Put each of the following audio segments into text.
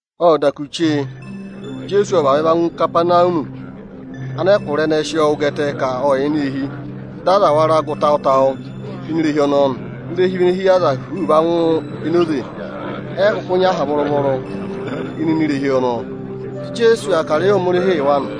Ộ da kù chee Ijeesu ộ vavẹ va ngụ Ikapanawumi. Anẹkụra ẹnẹẹ ẹ sị ọọ wụ́ gẹtẹ ka ọ yà ini eehi. Dị aza wara gụ tawụ-tawụ ini irehi ọnọọ nị. Irehi vị ene hí yị aza huuu va ngụ enoze. Ẹ yị kụkụ nyị aha vụrụ-vụrụ ịnịnẹ irehi ọnọọ. Dị Ijeesu aa kà ịrẹyị Ohomorihii yị wa nị.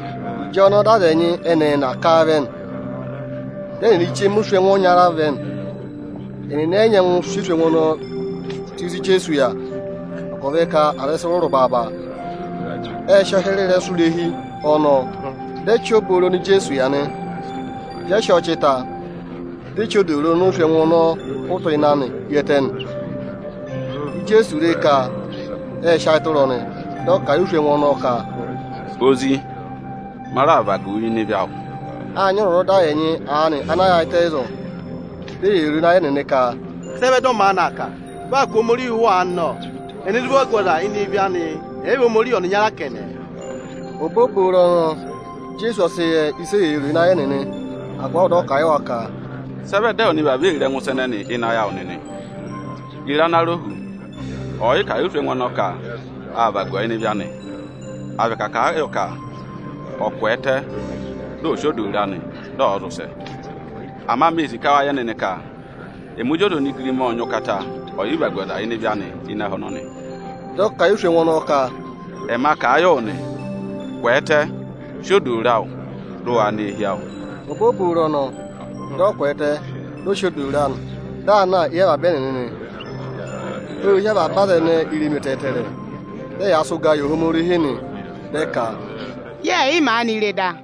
Ịjọnọọ dị aza ẹnị ẹẹna ẹnyị aanị ká a vẹ nị. Dị ẹnịnị chema oswẹngụ ọnyara vẹ nị. Ẹnịnị ẹ yị nyẹngụ sị oswẹngụ ọnọọ tù ịzị Ijeesu yà, agụvị ka aza ẹ sị rụrụ baaba. Ệ sị ọọ hịrẹ ịrẹsụ irehi ọnọọ. Dị ẹ chị obooro oni Ijeesu yà nị. Ịjị ẹ sị ọọ chị ta, di e chí odooro oni oswẹngụ ọnọọ hụtụ ịnị anị hi ẹtẹ nị. Ịjị Ijeesu re ka ệ sị ayị tụra ọnị, dị ọ kà a yị oswẹngụ ọnọọ ka, “Ozi, ma raà vagu wu ịnị ịvị awụ.” Â nyị ọzwọzọda ẹnyị aanị ana yaayịtẹ ịzọọ. Di eyee ro o ịnị ayị ẹnịnị ka: “Sị ẹ vẹ dị ọ maanị aa kà? Vị aa kụ̀ Ohomorihi ụhụ aanị nọ! Ẹnẹ zụ vagu ọza ịnị ịvị anị, ẹ̀ yị vị Ohomorihi ọnịnya kẹnẹ?” Obooboro ọnọọ Ijeesu ọ sị yẹ ịsị eyee ro ịnị ayị ẹnịnị. Agụvị avọọ dị ọ kà a yị wa ka, “Sị ẹ vẹ dị ẹwụ nịnị vavọọ ee ro ẹngụ ịsa ẹnẹnị ịnị ayị awụ nịnị? Ye re ana rọ hu, ọyịkà yị oswẹngụ ọnọọ ka â vagu ọọ ịnị ịvị anị, à vị ka à kà a yọ ka ọ̀ kwẹẹtẹ, dị ọ̀ sị odooro anị, dị ọ̀ zị ụsẹ?” Ama mee sì ka wa yẹ nịnị ka ẹmị Ozi ọza onigirima ộ nyị ụkata ọyịvagu ọza ịnị ịvị anị ịnị ẹhẹ ọnọnị. Dị ọ kà a yị oswẹngụ ọnọọ ka: “Ẹma kà a yị wụ nị: Kwẹẹtẹ, sị odooro awụ, dị ụ waa nọ eehi awụ!” Obooboro ọnọọ, dị ọ kwẹẹtẹ, dị ọ sị odooro anị, dị aa na éyi avaba ẹnịnị nị. Ô hí avaba aza ẹnẹẹ irenu ẹtẹẹtẹrẹ, dị ẹyaa sị ụgaa yị Ohomorihi nị. Dị ẹ ka, “Yẹẹ̀ yị maanị re da.”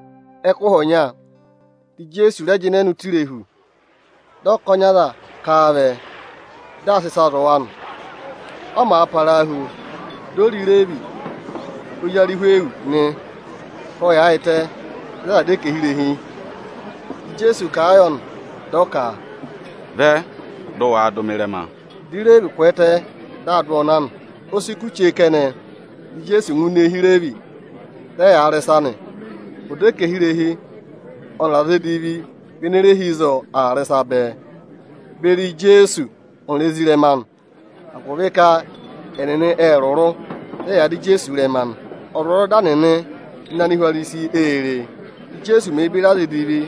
Ẹkụhị ọnya dị Ijeesu rẹ jịnẹ nọ ụtọ irehu, dị ọkọnị aza ká a vẹ, dị aa sị ịsaa zụ̀ wa nị. Ọ màa parahu, di o re Ireevi, ozi Arịhwịyọsị, ka ọ yaayịtẹ ịzị a yàā dọ ẹkẹhị irehi. Dị Ijeesu kà a yọ ka, “Vẹ, dị ụ waa dụ mị ịrẹma!” Dị Ireevi kwẹẹtẹ, dị aa dụ ọọ na nị. O si kù chee kẹnẹ, dị Ijeesu ngụ ini eehi Ireevi, dị ẹyaa rị ịsa nị. Ọdẹkẹhirehi ọnịrị aza edivi vị ene re hi ịzọọ aa rị ịsa bẹẹ beri Ijeesu ọnịrị ezirẹma anị; agụvị ka ẹnịnị ệ rụrụ, dị ẹyaa dụ Ijeesu ịrẹma nị. Ọzwọzọda nịnị ana rẹ vị Anihwarisi ê re, Íjeesu mèe beri aza edivi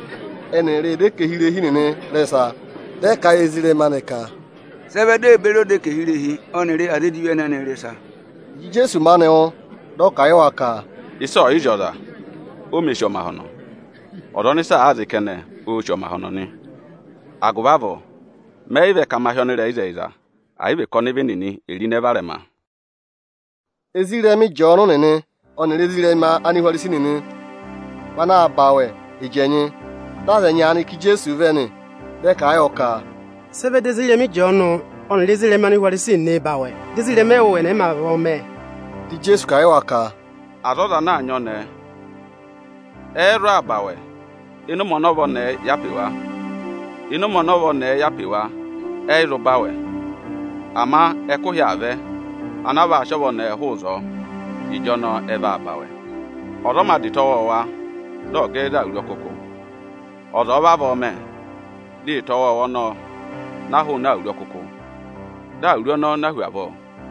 ẹnịrị ọdẹkẹhirehi nịnị rị ịsa. Dị ẹ kà a yị ezirẹma anị ka, “Sị ẹ vẹ di ee beri ọdẹkẹhirehi ọnịrị aza edivi nịnị ị rị ịsa?” Ịjị Ijeesu maanị wụ́, dị ọ kà a yị wa ka, “Ịsa ọ̀ yị zị ọza, o mē sì ọmahọnọ. Ọza ọnị ịsa aa zị kẹnẹ, oō sì ọmahọnọ nị. Agụvị avọọ mẹ yị vẹ ka ma hị́ ọnịrẹyịzẹyịza, ẹ̀ yị vị ka ọnịvị nịnị è ro ịnẹ varẹma.” Ezirẹma Ịjọọnụ nịnị ọnịrị ezirẹma Anihwarisi nịnị vị anaā ba awẹ ịjẹnyị. Dị aza ẹnyị aanị ká Ijeesu vẹ nị, dị ẹ kà a yọ ka, “Sị ẹ vẹ dị ezirẹma Ịjọọnụ ọnịrị ezirẹma Anihwarisi nịnịị̄ ba awẹ, dị ezirẹma ẹwụ ẹnị ẹ̀ yị mā vavọọ mẹ?” Dị Ijeesu kà a yị wa ka, “Aza ọza ana aa nyị ọnẹẹ ẹ́ẹ́ zụ ba awẹ ịnị ụmẹ ọnị ọva ọnẹẹ yà pe wa? Ịnị ụmẹ ọnị ọva ọnẹẹ yà pe wa, ẹ yị zụ ba awẹ. Ama ẹkụhị aa vẹ anaa vaa sị ọva ọnẹẹ hụụ ịzọọ, ịjọnọọ ẹ vaa ba awẹ. Ọza ọ mā dà ịta ọwọọwa dị ọ̀ gẹ ẹ za awuru ọkụkụ. Ọza ọ̀ọ vavọọ mẹ, dị ịta ọwọọwa ọnọọ na hụụnị awuru ọkụkụ, dị awuru ọnọọ na hu avọọ.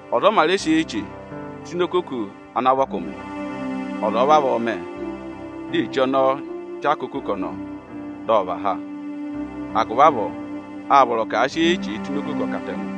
Ọza ọ mā rẹ sị eyi-eche tụ́ ini okoko ana vị ọkụmị. Ọza ọ̀ọ vavọọ mẹ, dị eche ọnọọ chaka okoko ọnọọ, dị ọ và ha. Agụvị avọọ â vọrọ ka à sị eyi-eche tụ́ ini okoko ọkatẹngụ.”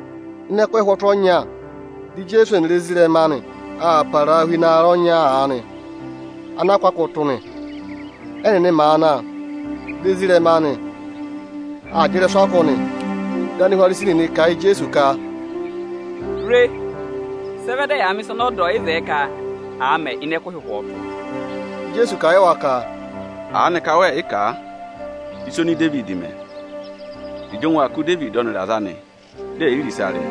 Ịnị ẹkụhị ụhwọtụ ọnya dị Ijeesu ọnịrị ezirẹma anị aa parahu ịnị aarẹ ọnya aanị ana a kụ́ akụ tụ́ nị. Ẹ́nịnị màa na, dị ezirẹma anị aa jị ịrẹsụ akụ anị. Dị Anihwarisi nịnị kà a yị Ijeesu ka, “Re, sị ẹ vẹ dị ẹyaa mẹ̀ ịsa ọnị ọda ọ̀ yị zẹẹ ka à mẹ ịnị ẹkụhị ụhwọtụ?” Dị Ijeesu kà a yị wa ka, “Aanịka wẹẹ̀ yị kà ịsa oni Idevidi mẹ, ịjị ụngwẹ aa kụ̀ ọnịrị aza anị dị è yi re ịsa rị?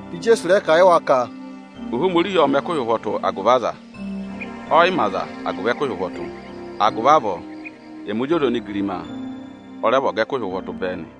Dị Ijeesu rẹ kà a yị wa ka, “Ohomorihi ộ mẹ̀ ẹkụhị ụhwọtụ agụvị aza; ọ́ yị mẹ aza agụvị ẹkụhị ụhwọtụ. Agụvị avọọ, ẹmị Ozi ọza onigirima ọ rẹ vị ọga ẹkụhị ụhwọtụ bẹẹ nị.”